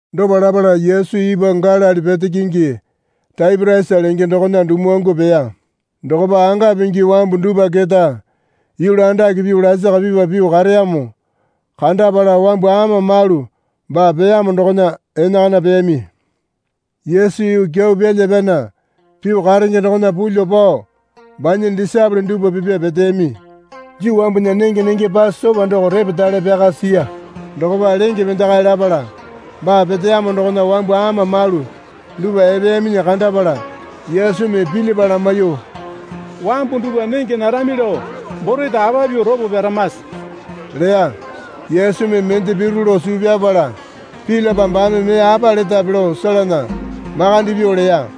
Dopa lapala Yesu ipwa Galili pete kingi Taipiriasa lenge dokona dumuwangu peya. Dokopa anga pingi wambu dupwa keta yulu andake pyuo lasaka pipa pyuo kareyamo kandapala wambu ama malu baa peyamo dokona enakana peyami. Yesu yuu kyau pyala pyana pyuo karenge dokona pulyuo pao banya disaepole dupwa pipya peteyami. Juu wambunya nenge nenge Pasopa doko repetale pyaka siya. Dokopa lenge pendekae lapala baa peteyamo dokona wambu ama malu dupwa epeyaminyi kandapala Yesumi Pilipa lamaiyuo, Wambu dupwa nenge narami lao borete apa pyuo ropo pyaramase? leya. Yesumi mende piru lao suu pyapala Pilipa baame mee apa letape lao selena makande pyuo leya.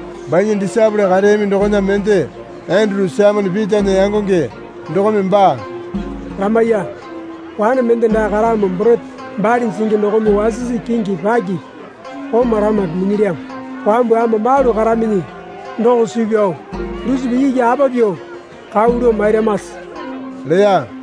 Banya disaepole kareyami dokona mende Enduru Saimone Pitana yangonge dokome baa lamaiya. Wane mende dae karamo borete bali jingi dokome wasisi kingi pakipi oma lamape minyilyamo. Wambu ama malu karaminyi doko suu pyao dusipa iki apa pyuo kau lao mairamase? leya.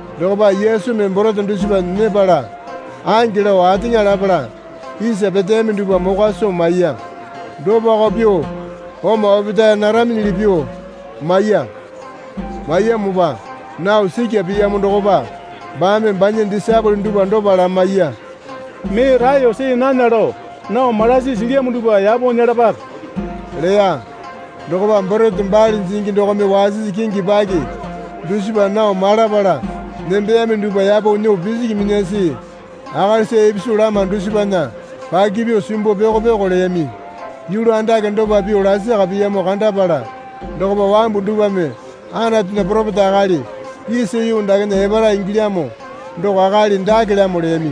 Dokopa Yesumi borete dusipa nyepala ange lao ateŋa lapala isa peteyami dupwa mokwa soo maiya. Dopako pyuo oma opetae naraminyili pyuo maiya. Maiyamopa nao sikya piyamo dokopa baame banya disaepole dupwa dopa lamaiya. Mee raeyo see nana lao nao malasi silyamo dupwa yapo nyelapape leya. Dokopa borete bali jingi dokome wasisi kingi paki dusipa nao malapala nembeyami dupwa yapo nyuo pisiki minyasi akalisa ipisu lama dusipana paki pyuo simbuo pyoko pyoko leyami. Yulu andake dopa pyuo lasaka piyamo kandapala dokopa wambu dupwame Anatunya poropeta akali isa yuu dakena epara ingilyamo doko akali dakelamo leyami.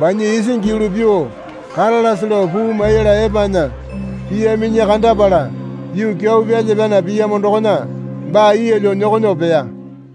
Banya isingi yulu pyuo karalase lao puu maiyala epanya piyaminyi kandapala yuu kyau pyalya pyana piyamo dokona baa yeelyo nyokonyuo peya.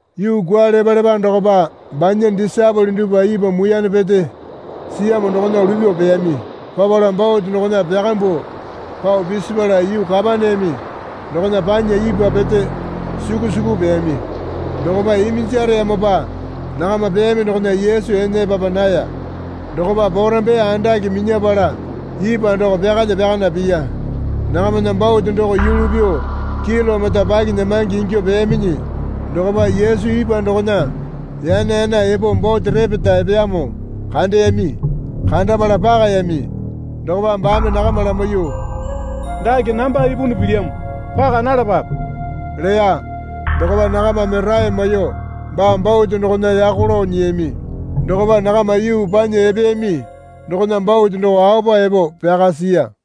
Yuu kwualepalepa dokopa banya disaepole dupwa ipwa muiyane pete siyamo dokona lupyuo peyami. Papala bote dokona pyakambuo pao pisipala yuu Kapaneame dokona panya ipwa pete suku suku peyami. Dokopa iminjareyamopa nakama peyami dokona Yesu ene epapa naya. Dokopa porambaiye andake minyapala ipwa doko pyakalya pyakana piya. Nakamana bote doko yulu pyuo kilomita pakinyamange ingyuo peyaminyi dokopa Yesu ipwa dokona yana yana epo bote repeta epeyamo kandeyami. Kandapala pakayami. Dokopa baame nakama lamaiyuo, Dake namba ipunu pilyamo. Paka nalapape leya. Dokopa nakamame rae maiyuo baa bote dokona yako lao nyiyami. Dokopa nakama yuu panya epeyami dokona bote doko aopa epo pyaka siya.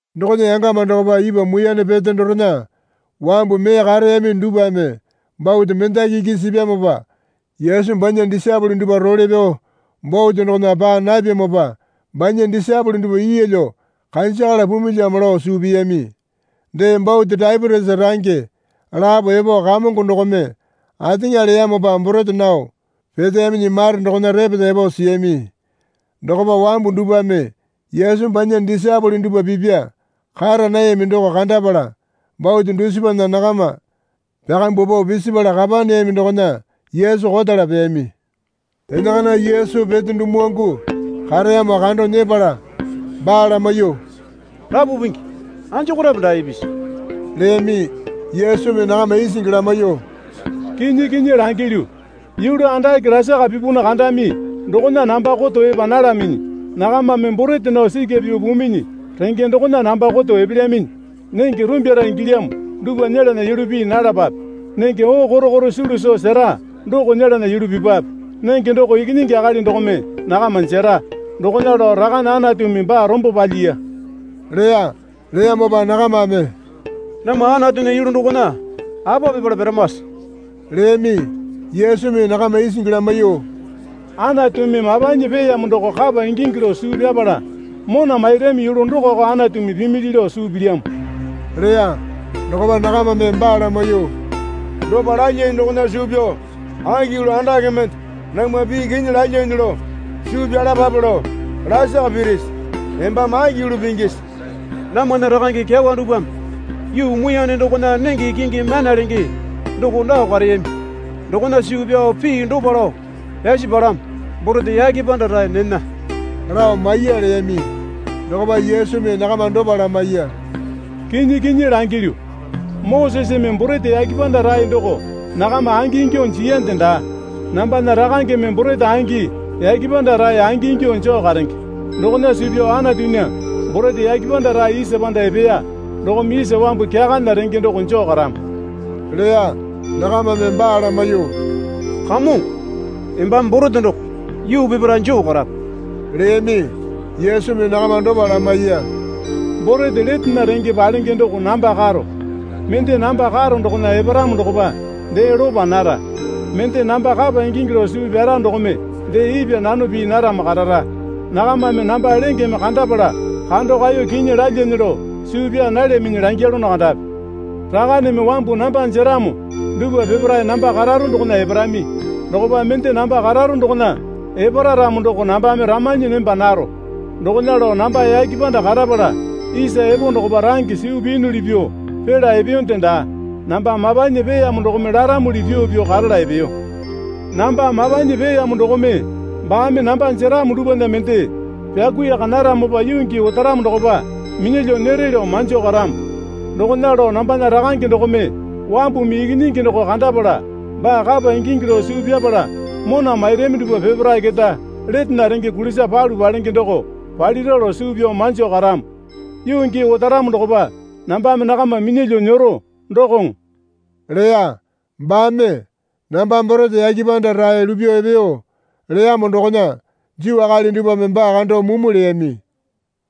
Dokona yangama dokopa ipwa muiyane pete dorena wambu mee kareyami dupwame bote mendaki iki sipyamopa Yesu banya disaepole dupwa role pyao bote dokona paa napyamopa banya disaepole dupwa yeelyo kanjakala pumilyamo lao suu piyami. Dee bote Taipitiasa range lapo epo Kamongo dokome ateŋa leyamopa borete nao peteyaminyi mare dokona repeta epo siyami. Dokopa wambu dupwame Yesu banya disaepole dupwa pipya kara nayami doko kandapala bote dusipana nakama pyakambuo pao pisapala Kapaneame dokona Yesu kotala peyami. Enakana Yesu pete dumuwangu kareyamo kando nyepala baa lamaiyuo, Rapu Pingi, anjokorape dae ipisi? leyami. Yesumi nakama isingi lamaiyuo, Kinyi kinyi langilyu, yulu andake lasaka pipunu kandami dokona namba koto epa nalaminyi, Nakamame borete nao sikya pyuo puminyi renge dokona namba koto epelyaminyi. Nenge rumbyara ingilyamo dupwa nyelana yulu pii nalapape. Nenge oo korokoro sulu soo sera doko nyelana yulu pipwape. Nenge doko Ikinyingi Akali dokome nakama jera. Dokona lao Rakane Anatumi baa rombo palyiya leya. Leyamopa nakamame, Namwa Anatunya yulu dokona apa pipala piramase? leyami. Yesumi nakama isingi lamaiyuo, Anatumi mapanyi peeyamo doko kapa ingingi lao suu pyapala mona mairami yulu dokoko Anatumi pimili lao suu pilyamo leya. Dokopa nakamame baa lamaiyuo, Dopa lalyane dokona suu pyao aki yulu andake mende namwa pii kinyi lalyane lao suu pyalapape lao lasaka pirisi? Embame aki yulu pingisi? Namwana rakange kyawa dupwame yuu muiyane dokona nenge kingi myana lenge doko nao kareyami. Dokona suu pyao pii dopa lao pyasi palamo. Borete yake panda rae nena lao maiya leyami. Dokopa Yesumi nakama dopa lamaiya. Kinyi kinyi langilyu, Moseseme borete yake panda rae doko nakama angi ingyuo jiyande daa. Nambana Rakangeme borete angi yake panda rae angi ingyuo joo karenge. Dokona suu pyao Anatunya borete yake panda rae isa panda epeya dokome isa wambu kyakana renge doko joo karamo leya. Nakamame baa lamaiyuo, Kamongo, embame borete doko yuu peparae joo karape leyami. Yesumi nakama dopa lamaiya. Borete letena renge palenge doko namba karo. Mende namba karo dokona eparamo dokopa dee lopa nara. Mende namba kapa ingingi lao suu pyara dokome dee ipwa nano pii naramo karara. Nakamame namba lengeme kandapala kando kaeyo kinyi lalyane lao suu pyaa nalyaminyi langyalono kandapi. Rakaneme wambu namba jeramo dupwa peparae namba kararo dokona eparami. Dokopa mende namba kararo dokona epara ramo doko nambame ramanyi nemba naro. Dokona lao namba yake panda karapala isa epo dokopa range suu piyunuli pyuo pila epeyonde daa. Namba mapanyi peeyamo dokome laramuli pyuo pyuo karala epeyo. Namba mapanyi peeyamo dokome baame namba jeramo dupwana mende pyakuiyaka naramopa yuu gii otaramo dokopa minyalyuo nyere lao manjo karamo. Dokona lao nambana Rakange dokome wambumi Ikinyingi doko kandapala baa kapa ingingi lao suu pyapala mona mairami dupwa peparae keta letena renge kulisa palu palenge doko palira lao suu pyao manjo karamo. Yuu gii otaramo dokopa nambame nakama minyalyuo nyero, dokoŋo leya. Baame, Namba borete yake panda rae lupyuo epeyo leyamo dokona Juu akali dupwame baa kando mumu leyami.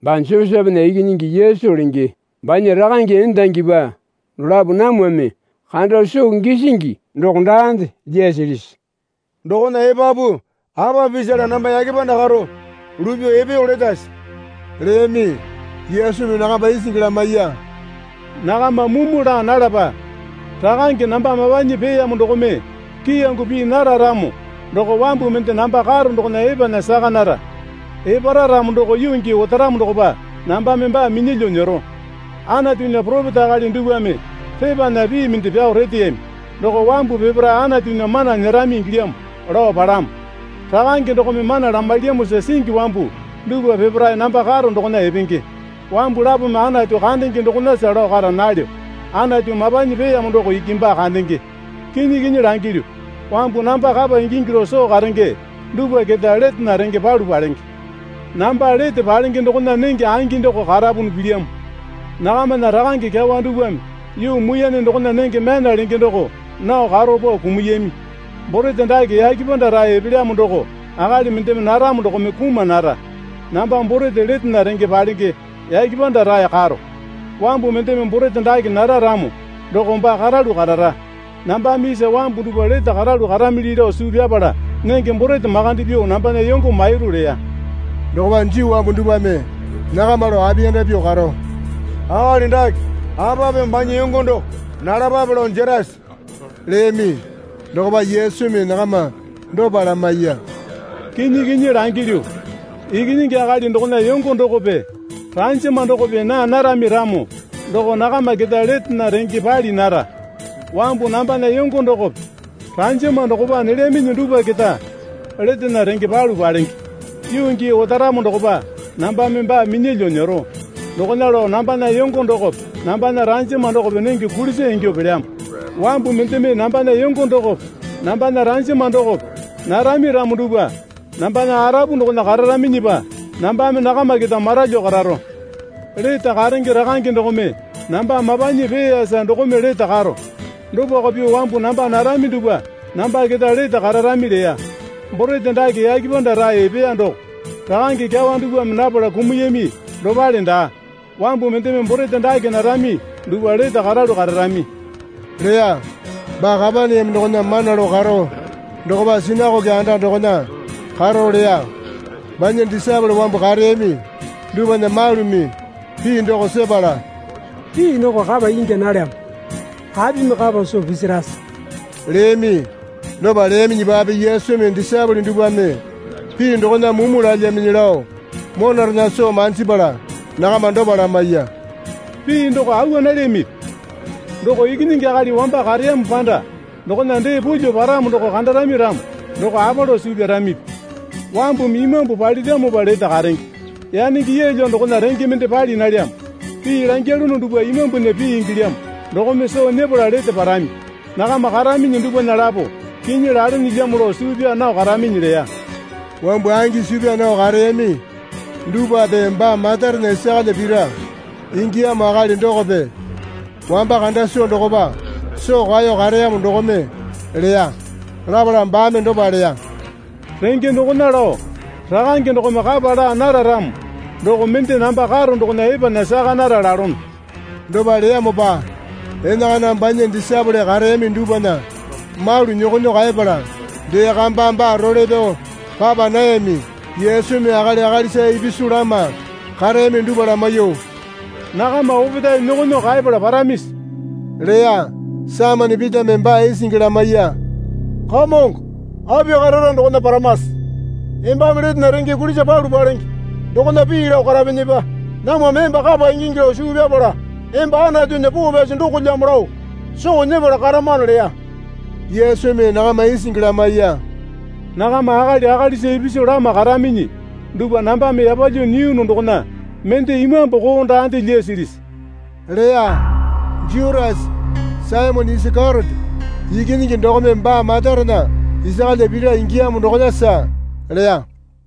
Baa Josepena ikinyingi Yesu lenge banya rakange endangipa dolapo namwame kando soo gisingi doko daande lyasilisi? Dokona epapu apa pisala namba yake panda karo lupyuo epeyo letase? leyami. Yesumi nakama isingi lamaiya. Nakama mumu laa nalapa. Rakange namba mapanyi peeyamo dokome kiyango pii nara ramo doko wambu mende namba karo dokona epanya saka nara. Epara ramo doko yuu gii otaramo dokopa nambame baa minyalyuo nyero. Anatunya poropeta akali dupwame pepana pii mende pyao reteyami. Doko wambu peparae Anatunya mana nyerami ingilyamo, lao palamo. Rakange dokome mana lamailyamosa singi wambu dupwa peparae namba karo dokona epenge. Wambu lapome Anatu kandenge dokonasa lao kara nalyo. Anatu mapanyi peeyamo doko iki baa kandenge. Kinyi kinyi langilyu, wambu namba kapa ingingi lao soo karenge dupwa keta letena range palu palenge. Namba lete palenge dokona nenge angi doko karapunu pilyamo. Nakamana rakange kyawa dupwame yuu muiyane dokona nenge myana lenge doko nao karo pao kumuyami. Borete dake yake panda rae epelyamo doko akali mendeme naramo dokome kuma nara. Namba borete letena renge palenge yake panda rae karo. Wambu mendeme borete dake nara ramo doko baa karalu karara. Nambame isa wambu dupwa lete karalu karamili lao suu pyapala nenge borete makande pyuo nambana yongo mairu leya. Dokopa Juu wambu dupwame nakama lao apiyanda pyuo karo, Akali dake apa pyuo banya yongo doko nalapape lao jerase? leyami. Dokopa Yesumi nakama dopa lamaiya. Kinyi kinyi langilyu, Ikinyingi Akali dokona yongo dokope ranjama dokope naa narami ramo doko nakama keta letena renge pali nara. Wambu nambana yongo dokope ranjama dokope nelyaminyi dupwa keta letena renge palu palenge. Yuu gii otaramo dokopa nambame baa minyalyuo nyero. Dokona lao nambana yongo dokope nambana ranjama dokope nenge kulisa ingyuo pelyamo. Wambu mendeme nambana yongo dokope nambana ranjama dokope narami ramo dupwa nambana arapu dokona kararaminyipa nambame nakama keta maralyuo kararo. Lete karenge Rakange dokome namba mapanyi peeyapala dokome lete karo. Dopako pyuo wambu namba narami dupwa namba keta lete kararami leya. Borete dake yake panda rae epeya doko. Rakange kyawa dupwame napala kumuyami dopale daa. Wambu mendeme borete dake narami dupwa lete karalu kararami leya. Baa Kapaneame dokona mana lao karo dokopa sinakoke anda dokona karo leya. Banya disaepole wambu kareyami dupwana malumi pii doko sepala, Pii doko kapa ingya nalyamo. Apimi kapa soo pisirase? leyami. Dopa leyaminyipape Yesumi disaepole dupwame pii dokona mumu lalyaminyi lao monarena soo manjipala nakama dopa lamaiya. Pii doko awa nalyamipi? Doko Ikinyingi Akali wamba kareyamo panda dokona dee pulyuo paramo doko kandarami ramo doko apa lao suu pyaramipi? Wambumi imambu paliramopa lete karenge. Yanenge yeelyo dokona renge mende pali nalyamo. Pii langyalono dupwa imambunya pii ingilyamo dokome soo nyepala lete parami. Nakama karaminyi dupwana lapo kinyi lalenelyamo lao suu pyaa nao karaminyi leya. Wambu angi suu pyaa nao kareyami dupwape baa matarena isakalya pira ingiyamo akali dokope wamba kanda soo dokopa soo kaeyo kareyamo dokome leya. Lapala baame dopa leya. Renge dokona lao Rakange dokome kapa laa nara ramo doko mende namba karo dokona epanya saka nara lalono leya. Dopa leyamopa enakana banya disaepole kareyami dupwana malu nyokonyuo kaepala dee kamba baa role pyao papa nayami. Yesumi akali akalisa ipisu lama kareyami dupwa lamaiyuo, Nakama opetae nyokonyuo kaepala paramisi? leya. Saimone Pitame baa isingi lamaiya. Kamongo, api karara dokona paramase? Embame letena renge kulisa palu palenge dokona pii lao karapinyipa, namwame emba kapa ingingi lao suu pyapala emba Anatunya Poo Pyasi dokolyamo lao soo nyepala karamano leya. Yesumi nakama isingi lamaiya. Nakama akali akalisa ipisu lama karaminyi dupwa nambame yapalyuo nyiyunu dokona mende imambu koo daande lyasilisi? leya. Jutasa, Saimone Isakeriote ikinyingi dokome baa matarena isakalya pira ingiyamo dokonasa leya.